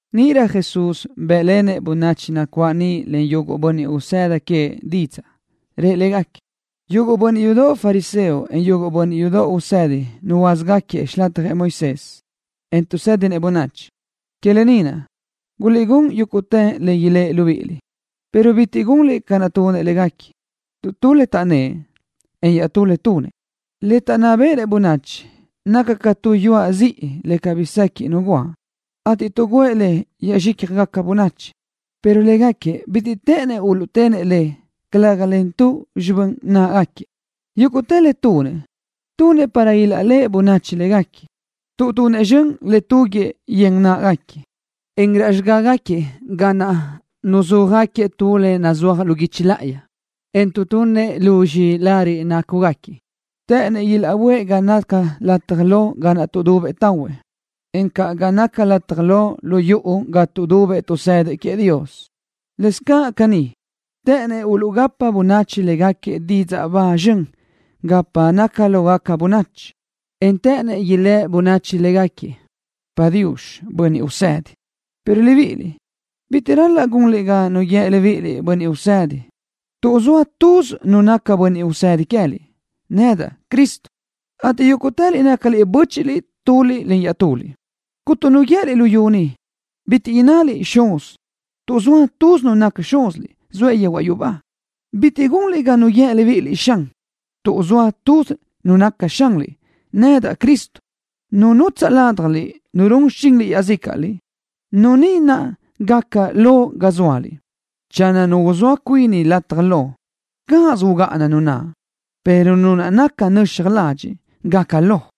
Níʼirö Jesús bë́ʼlenëʼ bönachi nacuáʼ niʼ len yuguʼ bönniʼ usëdi queëʼ didzaʼ. Rëʼ légaquiëʼ: —Yuguʼ bönniʼ yudoʼ fariseo, en yuguʼ bönniʼ yudoʼ usedi nuhuöázagaquiëʼ xilatjëʼ Moisés, en tuʼsédinëʼ bönachi. Que lë ni naʼ, guliʼgún yúguʼtë le ilë́ʼ libíʼiliʼ, pero bitiʼ gunliʼ libíʼiliʼ ca naʼ tunëʼ légaquiëʼ, tuʼ tu le taʼnnë́ʼ, en iaʼtú le tunëʼ. Le taʼnná béʼenëʼ bönachi naca ca tu yuaʼ ziʼi le cabí sequiʼ nu guáʼ, ateʼ tuʼguʼë le yaʼzxícjagaca bönachi, pero légaquiëʼ bitiʼ të́ʼënnëʼ uluʼtenëʼ le, calëga len tuze xibö́n náʼagaquiëʼ. Yúguʼtë le tunëʼ, tunëʼ para ilaʼléʼe bönachi légaquiëʼ, tuʼ tunëʼ zxön le túguiʼë yen náʼagaquiëʼ, en raʼ xigágaquiëʼ ga naʼ nuzúajgaquiëʼ tu le nazúaj lu guichi láʼayi, en tuʼtunnëʼ luzxi lariʼ nácugaquiëʼ. Të́ʼënnëʼ ilaʼböʼë ga naca lataj lo ga naʼ tuʼdubëʼ tahuëʼ, encaʼ ga naʼ naca lataj lo lu yuʼu ga tuʼdubëʼ tuʼsëdëʼ queëʼ Dios. Lëscaʼ caní, të́ʼënnëʼ uluʼgapa bönachi légaquiëʼ didzaʼ ba zxön gapa naca lógaca bönachi, en të́ʼënnëʼ ilë́ bönachi légaquiëʼ: “Padiux, bönniʼ usedi.” ’Pero libíʼiliʼ, bitiʼ ral-laʼ gunliʼ ga nu guíë libíʼiliʼ: Bönniʼ Usedi, tuʼ zoa tuz Nu naca Bönniʼ Usedi queë́liʼ, nedaʼ, Cristo, ateʼ yúguʼtëliʼ nácaliʼ bö́chiʼliʼ tuliʼ iaʼtuliʼ. Cuntu nu guië́liʼ luyú ni, bitiʼ innaliʼ: Xuz, tuʼ zoa tuz Nu naca Xúziliʼ, zoëʼ yehuaʼ yubá. Bitiʼ gunliʼ ga nu guíë libíʼiliʼ: Xan, tuʼ zoa tuz Nu naca Xanliʼ, nedaʼ, Cristo. Nu nutsaʼ ládjaliʼ nu run xichinliʼ iaʼzícaʼröliʼ, nu ni naʼ gácarö lo ga zóaliʼ. Channö nu uzóa cuini lataj lo, cáʼasö ugáʼana nu naʼ, pero nu naca nöxaj ladxiʼ, gaca lo.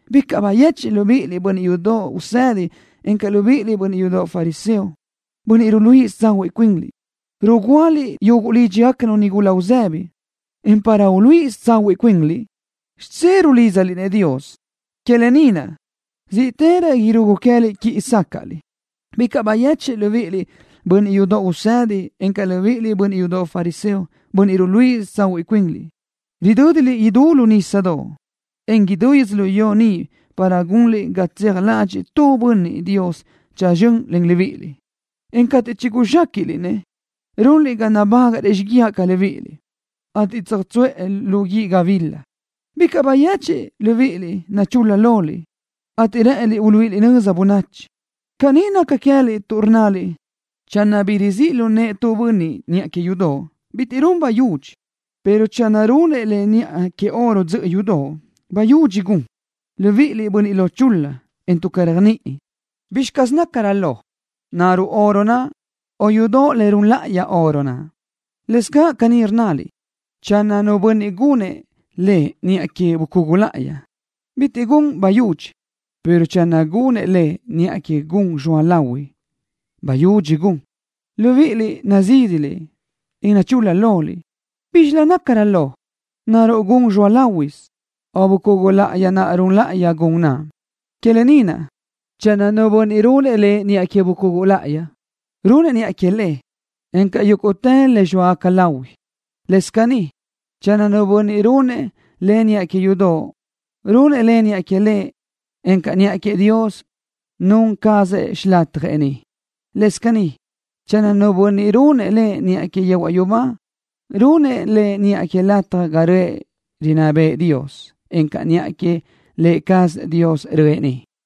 ’Bicaʼ bayechiʼ libíʼiliʼ, bönniʼ yudoʼ usedi, encaʼ libíʼiliʼ, bönniʼ yudoʼ fariseo, bönniʼ ruluíʼisö tsahuiʼ cuinliʼ. Rugúaliʼ yuguʼ lídxigacanu nigula uzë́bidoʼ, en para uluíʼisö tsahuiʼ cuinliʼ, xidzé rulídzaliʼ-nëʼ Dios. Que lë ni naʼ, zíʼtërö irugu queë́liʼ quíʼi sácaʼliʼ. ’Bicaʼ bayechiʼ libíʼiliʼ, bönniʼ yudoʼ usedi, encaʼ libíʼiliʼ, bönniʼ yudoʼ fariseo, bönniʼ ruluíʼisö tsahuiʼ cuinliʼ. Ridö́diliʼ idú lu nísadoʼ, en idú yödzölió ni para gunliʼ ga tseaj ládxëʼë tu bönniʼ Dios tsözxö́n len libíʼiliʼ, en cateʼ chiguzxéquiʼliʼ-nëʼ, runliʼ ga nabágaʼrëʼ xíguiaʼ ca libíʼiliʼ, ateʼ tsöjtsuʼë lu guíʼ gabila. ’Bicaʼ bayechiʼ libíʼiliʼ. Nachul-la loliʼ, ateʼ rë́ʼëniliʼ uluíʼiliʼ nöza bönachi. Caní naca queë́liʼ tuʼ rnnaliʼ: “Channö bi rizíʼ lu nëʼë tu bönniʼ niʼa que yudoʼ, bitiʼ run bayudxi, pero channö runëʼ le niʼa que oro dzöʼö yudoʼ, bayudxi gun.” Libíʼiliʼ, bönniʼ lo chul-la, en tuʼ caréajniʼi. ¿Bízxilö nácarö lo? ¿Naruʼ oro naʼ, o yudoʼ le run láʼayi oro naʼ? Lëscaʼ caní rnnaliʼ: “Channö nu bönniʼ gunëʼ le niʼa que bucugu láʼayi, bitiʼ gun bayudxi, pero channö gunëʼ le niʼa que gun zxoa lahui, bayudxi gun.” Libíʼiliʼ, nazídiliʼ, en nachul-la loliʼ. ¿Bízxilö nácarö lo? ¿Naruʼ gun zxoa láhuisö, o bucugu láʼayi naʼ run láʼayi gun naʼ? Que lë ni naʼ, channö nu bönniʼ runëʼ le niʼa que bucugu láʼayi, runëʼ le niʼa que le, encaʼ niʼa que yúguʼtë le zxóagaca láhuisö. Lëscaʼ caní, channö nu bönniʼ runëʼ le niʼa que yudoʼ, runëʼ le niʼa que le, encaʼ niʼa queëʼ Dios, nun cazëʼ xilatjëʼ niʼ. Lëscaʼ caní, channö nu bönniʼ runëʼ le niʼa que yehuaʼ yubá, runëʼ le niʼa que lataj ga röʼë rinná bëʼë Dios, encaʼ niʼa que Lë cazëʼ Dios röʼë niʼ.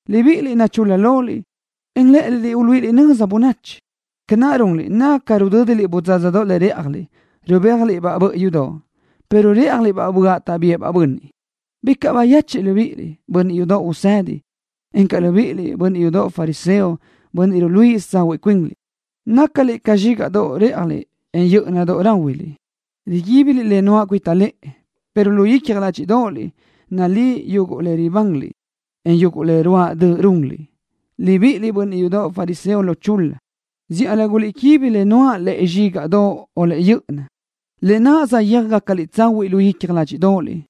Libíʼiliʼ, nachul-la loliʼ, en rë́ʼëniliʼ uluíʼiliʼ nöza bönachi. Ca naʼ runliʼ naca ca rudö́diliʼ bödzádzadoʼ le réʼjaliʼ, rubéajgacaliʼ-baʼ bö́ʼiyudoʼ, pero rë́ʼjaliʼ-baʼ böaʼ taʼbíëʼ-baʼ bönniʼ. ’Bicaʼ bayechiʼ libíʼiliʼ, bönniʼ yudoʼ usedi, encaʼ libíʼiliʼ, bönniʼ yudoʼ fariseo, bönniʼ ruluíʼisö tsahuiʼ cuinliʼ. Nácaliʼ ca zxígaʼdoʼ réʼjaliʼ, en yö́ʼöna ráhuiliʼ. Riguíbiliʼ le nuáʼ cuita lëʼe, pero lu icja ládxiʼdoʼoliʼ nalí yuguʼ le ribanliʼ, en yuguʼ le ruáʼ döʼ runliʼ. Libíʼiliʼ, bönniʼ yudoʼ fariseo lo chul-la. Zíʼalö guliʼquibi le nuáʼ lu zxígaʼdoʼ, en lu yö́ʼöna, lë naʼ saʼyéaj gácaliʼ tsahuiʼ lu icja ládxiʼdoʼoliʼ,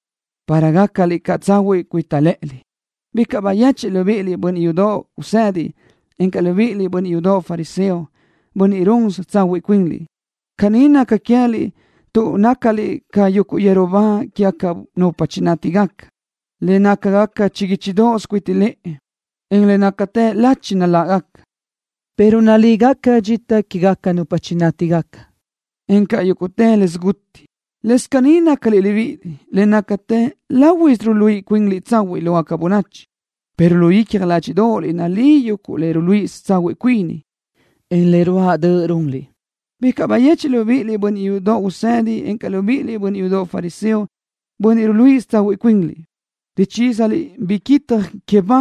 para gácaliʼ caʼ tsahuiʼ cuita lë́ʼëliʼ. ’Bicaʼ bayechiʼ libíʼiliʼ, bönniʼ yudoʼ usedi, encaʼ libíʼiliʼ, bönniʼ yudoʼ fariseo, bönniʼ ruluíʼisö tsahuiʼ cuinliʼ. Caní naca queë́liʼ tuʼ nácaliʼ ca yuguʼ yeru ba quégaca nupa chinátigaca, le nácagaca chiguíchidoʼos cuita lëʼe, en le nácatë lachi naláʼgaca, pero nalígaca dxita quégaca nupa chinátigaca, encaʼ yúguʼtë le siguti. Lëscaʼ caní nácaliʼ libíʼiliʼ. Le nácatë láhuisö ruluíʼi cuinliʼ tsahuiʼ lógaca bönachi, pero lu icja ládxiʼdoʼoliʼ naliliʼ yuguʼ le ruluíʼisö tsahuiʼ cuini, en le ruáʼ döʼ runliʼ. ’Bicaʼ bayechiʼ libíʼiliʼ, bönniʼ yudoʼ usedi, encaʼ libíʼiliʼ, bönniʼ yudoʼ fariseo, bönniʼ ruluíʼisö tsahuiʼ cuinliʼ. Ruchísaliʼ biquitaj que ba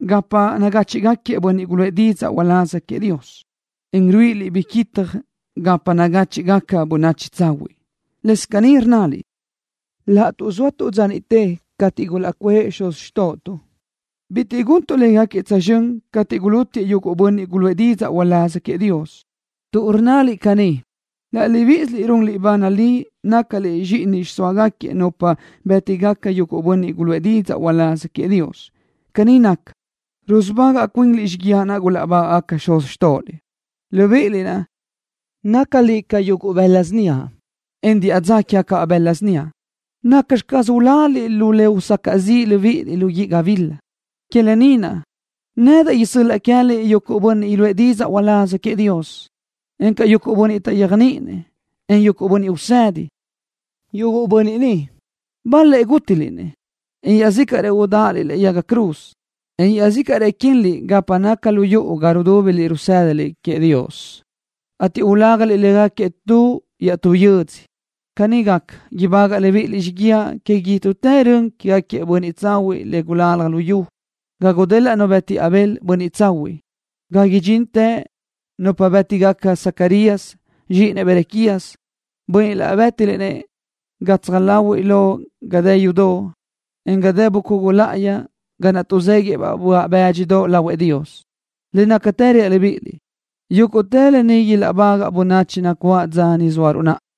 gapa nagáchiʼgaquiëʼ bönniʼ guluʼë didzaʼ uláz queëʼ Dios, en ruíʼiliʼ biquitaj gapa nagáchiʼgaca bönachi tsahuiʼ. Lëscaʼ caní rnnaliʼ: “Laʼtuʼ zóatuʼ dza niʼte cateʼ gulaʼcuʼë xuz xtóʼotuʼ, bitiʼ guntuʼ légaquiëʼ tsözxö́n cateʼ gulútiëʼ yuguʼ bönniʼ guluʼë didzaʼ uláz queëʼ Dios.” Tuʼ rnnaliʼ caní, laʼ libíʼisiliʼ runliʼ ba nalí nácaliʼ zxíʼini xiʼsóagaca nupa niʼ bétigaca yuguʼ bönniʼ guluʼë didzaʼ uláz queëʼ Dios. Caní naca, rusubagaʼ cuinliʼ xíguiaʼ naʼ gulaʼbáguiëʼ xuz xtóʼoliʼ. ’Libíʼiliʼ naʼ, nácaliʼ ca yuguʼ bëla síniaʼ, en diʼa dza quégacabaʼ bëla síniaʼ. ¿Nacxi caz uláliʼ lu le usacaʼ ziʼ libíʼiliʼ lu guíʼ gabila? Que lë ni naʼ, nedaʼ isö́l-laʼa queë́liʼ yuguʼ bönniʼ iluʼë didzaʼ uláz queëʼ Dios, encaʼ yuguʼ bönniʼ taʼyéajniʼinëʼ, en yuguʼ bönniʼ usedi. Yuguʼ bönniʼ ni, bal-lëʼ gútiliʼ-nëʼ, en iaʼzícaʼrëʼ udáʼaliʼ lëʼe yaga cruz, en iaʼzícaʼrëʼ quinliʼ gapa naca lu yuʼu ga rudúbiliʼ rusë́daliʼ queëʼ Dios, ateʼ ulágaliʼ légaquiëʼ tu iaʼtú yödzö. Caní gaca, ibágaʼliʼ libíʼiliʼ xíguiaʼ que idútë rön quégaquiëʼ bönniʼ tsahuiʼ le gulalaj luyú, ga gudelaʼ nu bëti Abel, bönniʼ tsahuiʼ, ga ridxintë nupa bë́tigaca Zacarías, zxíʼinëʼ Berequías, bönniʼ naʼ bë́tiliʼ-nëʼ gatsaj láhuiʼlö ga dë yudoʼ, en ga dë bucugu láʼayi ga naʼ tuʼzéguiʼëʼ böaʼ bë́dxidoʼ lahuëʼ Dios. Le nácatë reaʼ libíʼiliʼ, yúguʼtë lë ni ilaʼbagaʼ bönachi nacuáʼ dza ni zóaruʼ naʼa.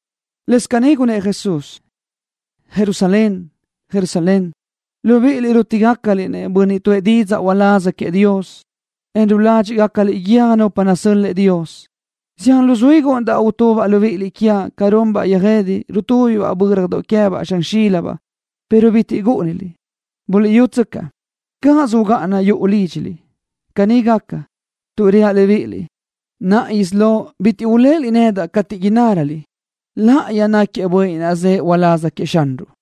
Lëscaʼ caní gunnë́ʼ Jesús: —Jerusalén, Jerusalén, libíʼiliʼ naʼ rútigacaliʼ-nëʼ bönniʼ tuʼë didzaʼ uláz queëʼ Dios, en ruládxiʼgacaliʼ guiö́j nupa nasö́l-lëʼë Dios. Zián luzuí gúʼunidaʼ utubaʼ libíʼiliʼ quiaʼ, ca runbaʼ yöjede, rutúbibaʼ bö́radoʼ queë́baʼ zxan xílibaʼ, pero bitiʼ gúʼuniliʼ. Buliʼyútsöcaʼ, cáʼasö ugáʼana yuʼu lídxiliʼ. Caní gaca, tuʼ reaʼ libíʼiliʼ, naʼa isí lo bitiʼ uléʼeliʼ nedaʼ cateʼ innáröliʼ: “Láʼayi náquiëʼ Bönniʼ naʼ zëʼë uláz queëʼ Xanruʼ.”